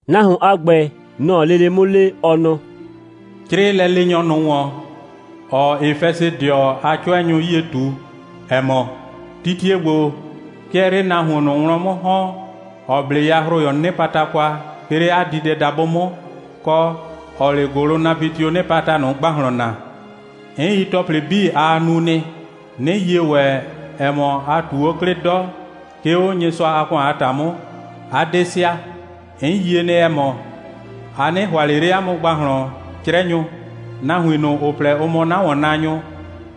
(Nahuon a ‑gbɛ, nɔ‑ɔ lele 'mʋ le, ɔ nɔ:) «'Crɩɩ lɛleenyɔ ꞊nʋ ‑wɔn, ‑ɔɔ Efɛsɩdɩɔ a 'cʋɛnyʋ 'yie ꞊tu, ‑ɛ mɔ: Titie ‑gbo, 'ke ɛɛ 'le nahuon ꞊nʋ wlɔn 'mʋ ‑hɔn, ‑ɔ 'ble yahroyɔɔ 'nɩpata kwa, 'ke 'le 'a diidɛdabʋ 'mʋ, kɔ, ‑ɔɔ 'le ‑gʋlʋnapɩtioo 'nɩpata ꞊nʋ ‑gbahlɔn naa. 'N yi ‑tɔplɩ 'bii, aa nu nɩ, 'nɩ yie ‑wɛ, ‑ɛ mɔ, a ꞊tu 'o 'klɩ 'dɔ, 'ke 'o Nyɩsʋa a ‑kʋan a ‑ta 'mʋ, 'a 'de sɩa. 'N yie nɩ, ‑ɛ mɔ, a 'nɩ ‑hʋa ꞊le 'le 'a mʋ ‑gbahlɔn 'crɛnyʋ. Nahuin ꞊nʋ, ‑ʋ plɛ, ‑ʋ mɔ 'na ‑wɔnnaanyʋ,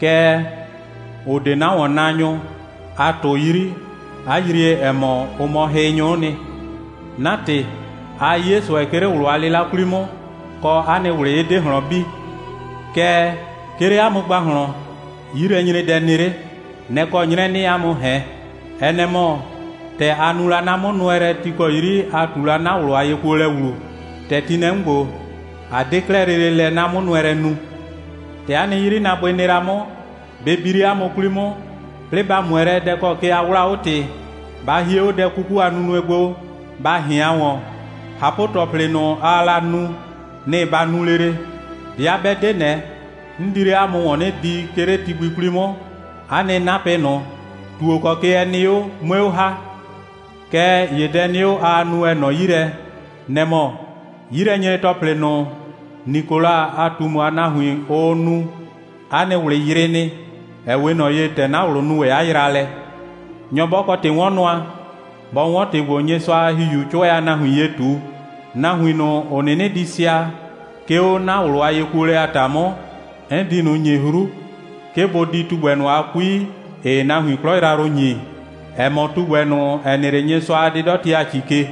kɛɛ, ‑ʋ 'de 'na ‑wɔnnaanyʋ, a ꞊tʋ 'yri, 'a yrie, ‑ɛ mɔ, ʋ mɔ hɩnyʋ'ʋ nɩ. 'Na ‑tɩ, aa 'ye ꞊sʋɛ, 'ke 'le ꞊wlʋ a 'lɩla 'kwli 'mʋ, kɔ, 'a nɩ ꞊wlɩ 'ɩ 'de ꞊hlɔn bi. Kɛɛ, 'ke 'le 'a mʋ ‑gbahlɔn, 'yilɛnyredɛ nɩ 'le. Nɛ‑ kɔ 'nyrɛ 'nɩɩ 'a mʋ ꞊hɛn. Ɛ nɛ‑ mɔ: ‑tɛ a nu la 'na 'mʋnʋɛlɛ, ti ‑kɔ 'yri a ꞊tu la 'na ꞊wlʋ a yekuolɛ ‑wlu, ‑tɛ ti nɩ lɛ 'mʋ ‑gbo, a 'de 'klɛɛ lele lɛ 'na 'mʋnʋɛlɛ nu. ‑Tɛ 'a nɩ 'yrinaabʋɩ nɩ la 'mʋ, bɩ bi 'le 'a mʋ 'kwli 'mʋ, 'plɩɩ ba ꞊mʋɛ lɛ, dɛ ‑kɔ ke a 'wlaa 'o ‑tɩ. Ba hie 'o dɛ 'kuku a nunue gbo, ba ꞊hɩan ‑wɔn. ꞊Hapʋ‑tɔplɩ ꞊nʋ, aa la nu, nɩ‑ ba nu lele. 'Bɩa 'bɛ 'de ꞊nɛ, 'n di 'le 'a mʋ ‑wɔn 'nɩ di, 'ke 'le ti gbi 'kwli 'mʋ, 'a nɩ 'napɩ ꞊nʋ, ‑tuo ‑kɔ ke ɛ nɩ 'o, 'mue 'o ‑ha. Kɛɛ ‑ye dɛ nɩ 'o, aa nu, ‑ɛ nɔ 'yi lɛ, nɛ‑ mɔ: 'yilɛnyre‑tɔplɩ ꞊nʋ, Nikola a ꞊tumu a nahuin, ʋʋ nu, 'a nɩ ꞊wlɩ yrɩɩ nɩ, ‑ɛ 'we ꞊nɔ ye, ‑tɛ 'na ꞊wlʋ nu ‑wɛ 'a yraalɛ. Nyɔ 'bɔ kɔ ‑tɩ'wɔnnʋa, bɔ 'wɔn ‑tɩ ‑gbo, Nyɩsʋa a ‑Hihiuu 'cʋɛ a nahuin ye ꞊tu. Nahuin ꞊nʋ, ‑ʋ 'nɩnɩ di sɩa, 'ke 'o 'na ꞊wlʋ a yekuolɛ a ‑ta 'mʋ, 'n di ꞊nʋ ‑nyi 'hru, 'ke bʋ di tugbɛ ꞊nʋ a 'kui, ‑ɩɩ nahuin 'klɔ yrayrʋ ‑nyi, ‑ɛ mɔ tugbɛ ꞊nʋ, ‑ɛ nɩ 'le Nyɩsʋa a 'dɩdɔti a ‑ci ke.»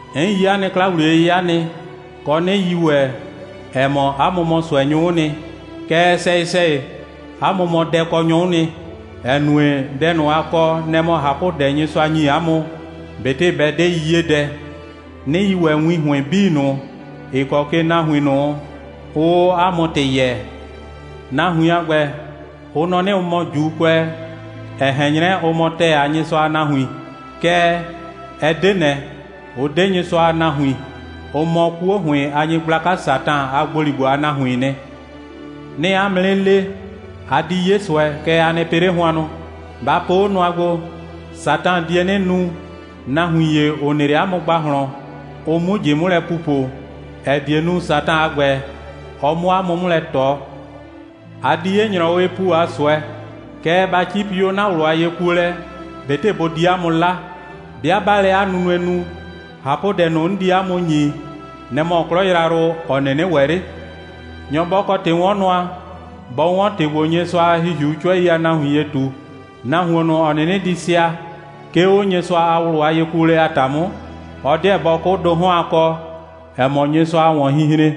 'N yi 'a nɩ 'kla‑wliye'yɩya nɩ, kɔ, 'nɩ yi ‑wɛ, ‑ɛ mɔ, 'a mʋ mɔ ꞊sʋɛnyʋ'ʋ nɩ. Kɛɛ, sɛyɩ‑sɛyɩ, 'a mʋ mɔ dɛkɔnyʋ'ʋ nɩ, ‑ɛ nue, dɛ ꞊nʋ, a kɔ, nɛ‑ mɔ ꞊hapʋdɛ, Nyɩsʋa ‑nyi 'a mʋ, ꞊betɩ bɛ 'de 'yiyedɛ; 'nɩ yi ‑wɛ win ‑hʋɩn 'bii ꞊nʋ, ‑ɩ kɔ ke nahuin ꞊nʋ, ʋʋ 'o 'a mʋ ‑tɩ yɛɛ. Nahuin a ‑gbɛ, ʋ nɔ 'nɩ, ʋ mɔ ‑Juukʋɛ, ‑ɛ ꞊hɛn 'nyrɛ, ʋ mɔ ‑tɛɛ a Nyɩsʋa a nahuin. Kɛɛ, ɛ 'de ꞊nɛ, ʋ 'de Nyɩsʋa a nahuin. Ʋ mɔ 'kuo ‑hʋɩn a nyɩgblaka Satan a ‑gboligbo a nahuiin nɩ. 'Nɩɩ 'a mʋ 'nɩ le, a di 'ye ꞊sʋɛ, kɛɛ, a nɩ pɩ 'le hʋannʋ. Ba po 'o nʋa gbo: Satan die 'nɩ nu, nahuin ‑ye, ‑ʋ nɩ 'le 'a mʋ ‑gbahlɔn, ʋ 'mu ꞊jɩ 'mʋ lɛ pupo, ‑ɛ die nu, Satan a ‑gbɛ, ɔ 'mʋ 'a mʋ 'mʋ lɛ ꞊tɔ. A di 'ye ‑nyrɔwɩɩ ‑pu a ꞊sʋɛ. Kɛɛ, ba 'cipi 'o 'na ꞊wlʋ a yekuolɛ, ꞊betɩ bʋ di 'a mʋ 'la. 'Bɩa 'baa lɛ 'a nunue nu, ꞊hapʋdɛ ꞊nʋ, 'n di 'a mʋ ‑nyi, nɛ‑ mɔ 'klɔ yrayrʋ, ‑ɔ 'nɩnɩ ‑wɛ 'le. Nyɔ 'bɔ kɔ ‑tɩ'wɔnnʋa, bɔ 'wɔn ‑tɩ ‑gbo, Nyɩsʋa a ‑Hihiuu 'cʋɛi a nahuin ye ꞊tu. Nahuon ꞊nʋ, ‑ɔ 'nɩnɩ di sɩa, 'ke 'o Nyɩsʋa a ꞊wlʋ a yekuolɛ a ‑ta 'mʋ, ɔ 'deɛ bɔ 'kʋ ‑do 'hɔn a kɔ, ‑ɛ mɔ Nyɩsʋa a ‑wɔnhinhren.»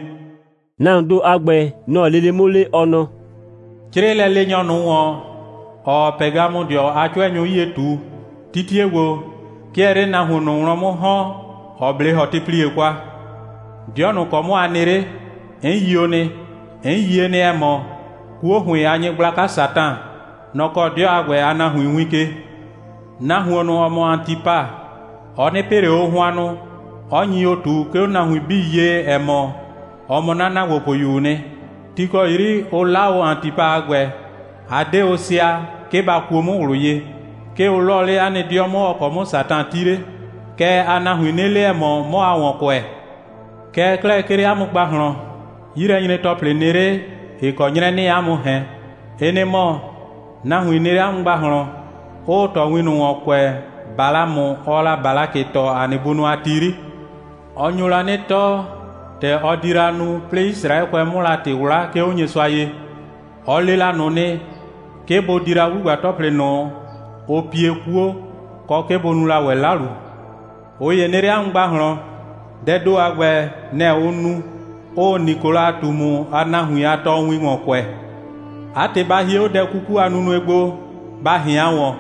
(Nahuoon ‑do a ‑gbɛ, nɔ‑ɔ lele 'mʋ le, ɔ nɔ:) «'Crɩɩ lɛleenyɔ ꞊nʋ ‑wɔn, ‑ɔɔ Pɛgamʋdɩɔ a 'cʋɛnyʋ 'yie ꞊tu: Titie ‑gbo, 'ke ɛɛ 'le nahuon ꞊nʋ wlɔn 'mʋ ‑hɔn, ‑ɔ 'ble ‑hɔtɩplie kwa. 'Dɩɔ ꞊nʋ ‑kɔ 'mʋ a nɩ 'le, 'n yio nɩ. 'N yie nɩ, ‑ɛ mɔ, 'kuo ‑hʋɩn a nyɩgblaka Satan, nɔ‑ kɔɔ 'dɩɔ a ‑gbɛ a nahuin win ke. Nahuon ꞊nʋ, ‑ɔ mɔ Antipa, ɔ 'nɩ pɩ ꞊le o hʋannʋ, 'ɔ nyi o ꞊tu, 'ke 'o nahuin 'bii ye, ‑ɛ mɔ, ɔ mɔ 'na ‑naagbopʋyuu nɩ. Ti ‑kɔ 'yri ʋ 'la o Antipa a ‑gbɛ, a 'de sɩa, 'ke ba kuo 'mʋ ꞊wlʋ ye. 'Ke ʋ 'lɔɔ 'le 'a nɩ 'dɩɔ 'mʋ, ‑ɔ kɔ 'mʋ Satan 'ti 'le. Kɛɛ, aa nahuin 'nɩ le, ‑ɛ mɔ, 'mɔ aa ‑wɔn kʋɛ. Kɛɛ 'klɛɛ, 'ke 'le 'a mʋ ‑gbahlɔn, 'yilɛnyre‑tɔplɩ nɩ 'le, ‑ɩ kɔ 'nyrɛ 'nɩɩ 'a mʋ ꞊hɛn. Ɩ nɩ‑ mɔ: nahuin nɩ 'le 'a mʋ ‑gbahlɔn, 'ʋʋ tɔɔwin ꞊nʋ ‑wɔn kʋɛ, Balamʋ, ɔɔ la Balakɩ tɔɔ, ‑a nɩ bunʋ a ti 'yri. Ɔ nyo la 'nɩ tɔɔ, ‑tɛ ɔ di la nu, 'plɩɩ Yisraɛkʋɛ 'mʋ la ‑tɩ 'wla, 'ke 'o Nyɩsʋa ye. Ɔ le la ꞊nʋ nɩ, 'ke bʋ di la 'wlugba‑tɔplɩ ꞊nʋ, ʋ pie 'kuo, kɔ, 'ke bʋ nu la ‑wɛ 'lalu. ꞊Ʋ ‑ye nɩ 'le 'a mʋ ‑gbahlɔn, dɛɛ ‑do a ‑gbɛ, nɛ‑ ʋʋ nu, 'ʋʋ Nikola a ꞊tumu a nahuin a tɔɔwin ‑wɔn kʋɛ. 'A ‑tɩ, ba hie 'o dɛ 'kuku a nunue gbo, ba ꞊hɩan ‑wɔn.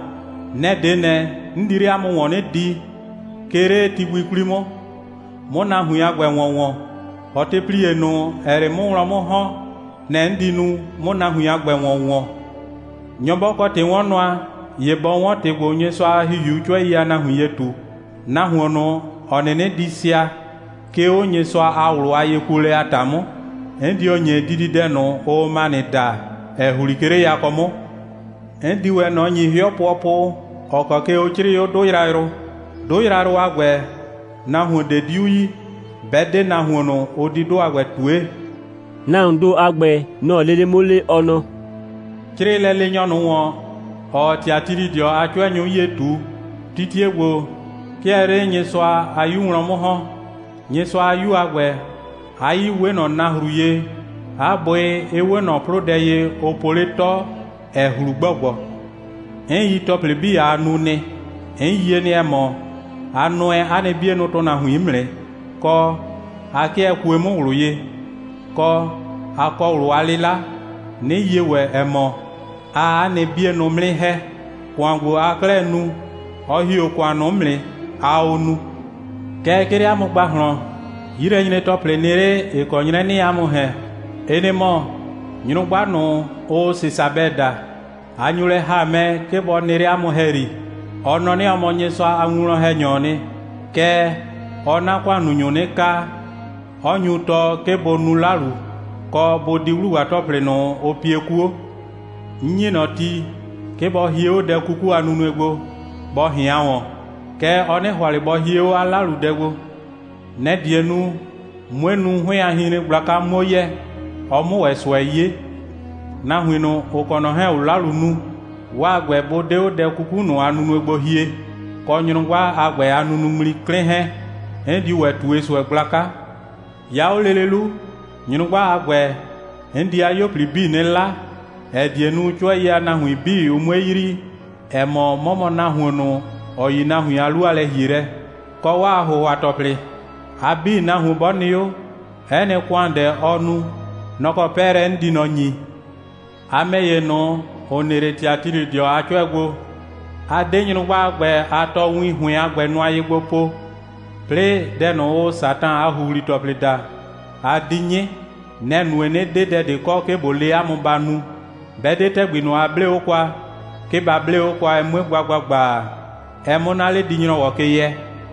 Nɛ‑ 'de ꞊nɛ, 'n di 'le 'a mʋ ‑wɔn 'nɩ di, 'ke 'le ti gbi 'kwli 'mʋ, 'mʋ nahuin a ‑gbɛ ‑wɔn ‑wɔn. ‑Hɔtɩplie ꞊nʋ, ‑ɛɛ 'le 'mʋ wlɔn 'mʋ ‑hɔn, nɛ‑ 'n di nu, 'mʋ nahuin a ‑gbɛ ‑wɔn ‑wɔn. Nyɔ 'bɔ kɔ ‑tɩ'wɔnnʋa, ‑ye bɔ 'wɔn ‑tɩ ‑gbo, Nyɩsʋa a ‑Hihiuu 'cʋɛi a nahuin ye ꞊tu. Nahuon ꞊nʋ, ‑ɔ 'nɩnɩ di sɩa, 'ke 'o Nyɩsʋa a ꞊wlʋ a yekuolɛ a ‑ta 'mʋ, 'n dio ‑nyi dididɛdʋ ꞊nʋ, ʋʋ manɩ daa, ‑ɛ ‑hli, 'ke 'le yakɔ 'mʋ. 'N di ‑wɛ ꞊nɔ ‑nyi 'hɩɔ pʋɔpʋ, ‑ɔ kɔ ke ʋ 'crɩɩ 'o 'dʋ yrayrʋ. 'Dʋ yrayrʋ a ‑gbɛ, nahuon ꞊de 'diu yi, 'bɛ 'de nahuon ꞊nʋ, ʋ di 'dʋ a ‑gbɛ ꞊tue.» (Nahuoon ‑do a ‑gbɛ, nɔ‑ɔ lele 'mʋ le, ɔ nɔ:) «'Crɩɩ lɛleenyɔ ꞊nʋ ‑wɔn, ‑ɔɔ Tiatilɩdɩɔ a 'cʋɛnyʋ 'yie ꞊tu: titie ‑gbo, 'ke ɛɛ 'le Nyɩsʋa a 'Yu wlɔn 'mʋ ‑hɔn. Nyɩsʋa a 'Yu a ‑gbɛ, 'a 'yii 'we ꞊nɔ nahru ye, 'a bʋɩ 'ɩ 'we ꞊nɔ 'plʋdɛ ye, ʋ po 'le 'tɔ, ‑ɛ ꞊hlu ‑gbɔgbɔ. 'N yi ‑tɔplɩ 'bii, aa nu nɩ. 'N yie nɩ, ‑ɛ mɔ, a nʋɛ 'a nɩ 'bienʋ ‑tʋnahuin 'mʋ nɩ, kɔ, 'a 'kɩɛ kue 'mʋ ꞊wlʋ ye, kɔ, 'a kɔ ꞊wlʋ a 'lɩla; 'nɩ yie ‑wɛ, ‑ɛ mɔ, aa 'a nɩ 'bienʋ 'mʋ 'nɩ ‑hɛ. ‑Kʋan ‑gbo, aa 'klɛɛ nu, ɔ ‑hi 'o ‑kʋan ꞊nʋ 'mʋ nɩ, aa o nu. Kɛɛ, 'ke 'le 'a mʋ ‑gbahlɔn, 'yilɛnyre‑tɔplɩ nɩ 'le, ‑ɩ kɔ 'nyrɛ 'nɩɩ 'a mʋ ꞊hɛn. Ɩ nɩ‑ mɔ: nyrʋgba ꞊nʋ, ʋʋ Sesabɛ daa, a nyo lɛ ‑ha mɛ, 'ke bɔ nɩ 'le 'a mʋ ‑hɛyri. Ɔ nɔ 'nɩ, ɔ mɔ Nyɩsʋa a winwlɔn‑hɛnyɔɔ nɩ. Kɛɛ, ɔɔ 'na ‑kʋannunyʋ 'nɩ kaa, 'ɔ nyu tɔɔ, 'ke bʋ nu 'lalu, kɔ, bʋ di 'wlugba‑tɔplɩ ꞊nʋ, ʋ pie 'kuo. 'N ‑nyi ꞊nɔ ti, 'ke bɔ hie 'o dɛ 'kuku a nunue gbo, bɔ ꞊hɩan ‑wɔn. Kɛɛ, ɔ 'nɩ ‑hʋa ꞊le bɔ hie 'o 'a 'laludɛ gbo. Nɛ‑ die nu, 'mue nu, 'hʋɩn a hinhren gblaka 'muo yɛ, ɔ 'mʋ ‑wɛ ꞊sʋɛ 'ye. Nahuin ꞊nʋ, ‑ʋ kɔ ꞊nɔ 'hɛɛn‑ o 'lalu nu, 'waa ‑gbɛ, 'bʋ 'de 'o dɛ 'kuku ꞊nʋ a nunue gbo hie, kɔ nyrʋgba a ‑gbɛ a nunuŋmli 'klɩn 'hɛɛn, 'n diu ‑wɛ ꞊tue ꞊sʋɛ gblaka. 'Ya 'o lele 'lu, nyrʋgba a ‑gbɛ, 'n di 'a 'yuo 'bii 'nɩ 'la, ‑ɛ die nu, 'cʋɛi a nahuin 'bii, ʋ 'mue yrii, ‑ɛ mɔ, 'mɔ mɔ nahuon ꞊nʋ, ‑ɔ yi nahuin a 'lu a lɛ‑hielɛ, kɔ 'waa ‑hʋhʋa‑tɔplɩ. A 'bii, nahuon 'bɔ nɩ 'o, 'ɛ nɩ ‑kʋandɛ, ɔ nu, nɔ‑ kɔ 'pɛɛlɛ 'n di ꞊nɔ ‑nyi. A ‑mɛ ‑ye ꞊nʋ, ‑ʋ nɩ 'le Tiatilɩdɩɔ a 'cʋɛ gbo, a 'de nyrʋgba a ‑gbɛ a tɔɔwin ‑hʋɩn a ‑gbɛ nʋa ye gbo po, 'plɩɩ dɛ ꞊nʋ, ʋʋ Satan a ‑huhli‑tɔplɩ daa, a 'di 'nyɩ. Nɛ‑ nue, 'nɩ 'de dɛ ꞊de kɔ, 'ke ꞊bo le 'a mʋ ba nu, 'bɛ 'de ‑tɛgbi ꞊nʋ, a 'blee 'o kwa, 'ke ba 'blee 'o kwa, ɛ 'mue gba ‑gbagba, ɛ 'mʋ 'na 'ledi‑nyrɔwɔ ke yɛ.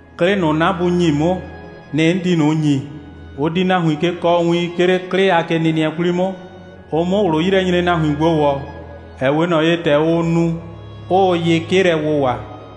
'Klɩ ꞊nʋ, 'na Bu ‑nyi 'mʋ, nɩ‑ 'n di ꞊nʋ ‑nyi. Ʋ di nahuin ke kɔɔ win, 'ke 'le 'klɩ a kenɩnɩɛ 'kwli 'mʋ, ʋ 'mʋ ꞊wlʋ'yilɛnyrenahuin gbo ‑wɔ, ‑ɛ 'we ꞊nɔ ye, ‑tɛ ʋʋ nu, 'ʋʋ yɩ 'kɩ lɛ wʋwa.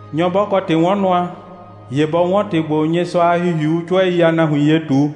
Nyɔ 'bɔ kɔ ‑tɩ'wɔnnʋa, ‑ye bɔ 'wɔn ‑tɩ ‑gbo, Nyɩsʋa a ‑Hihiuu 'cʋɛi a nahuin ye ꞊tu.»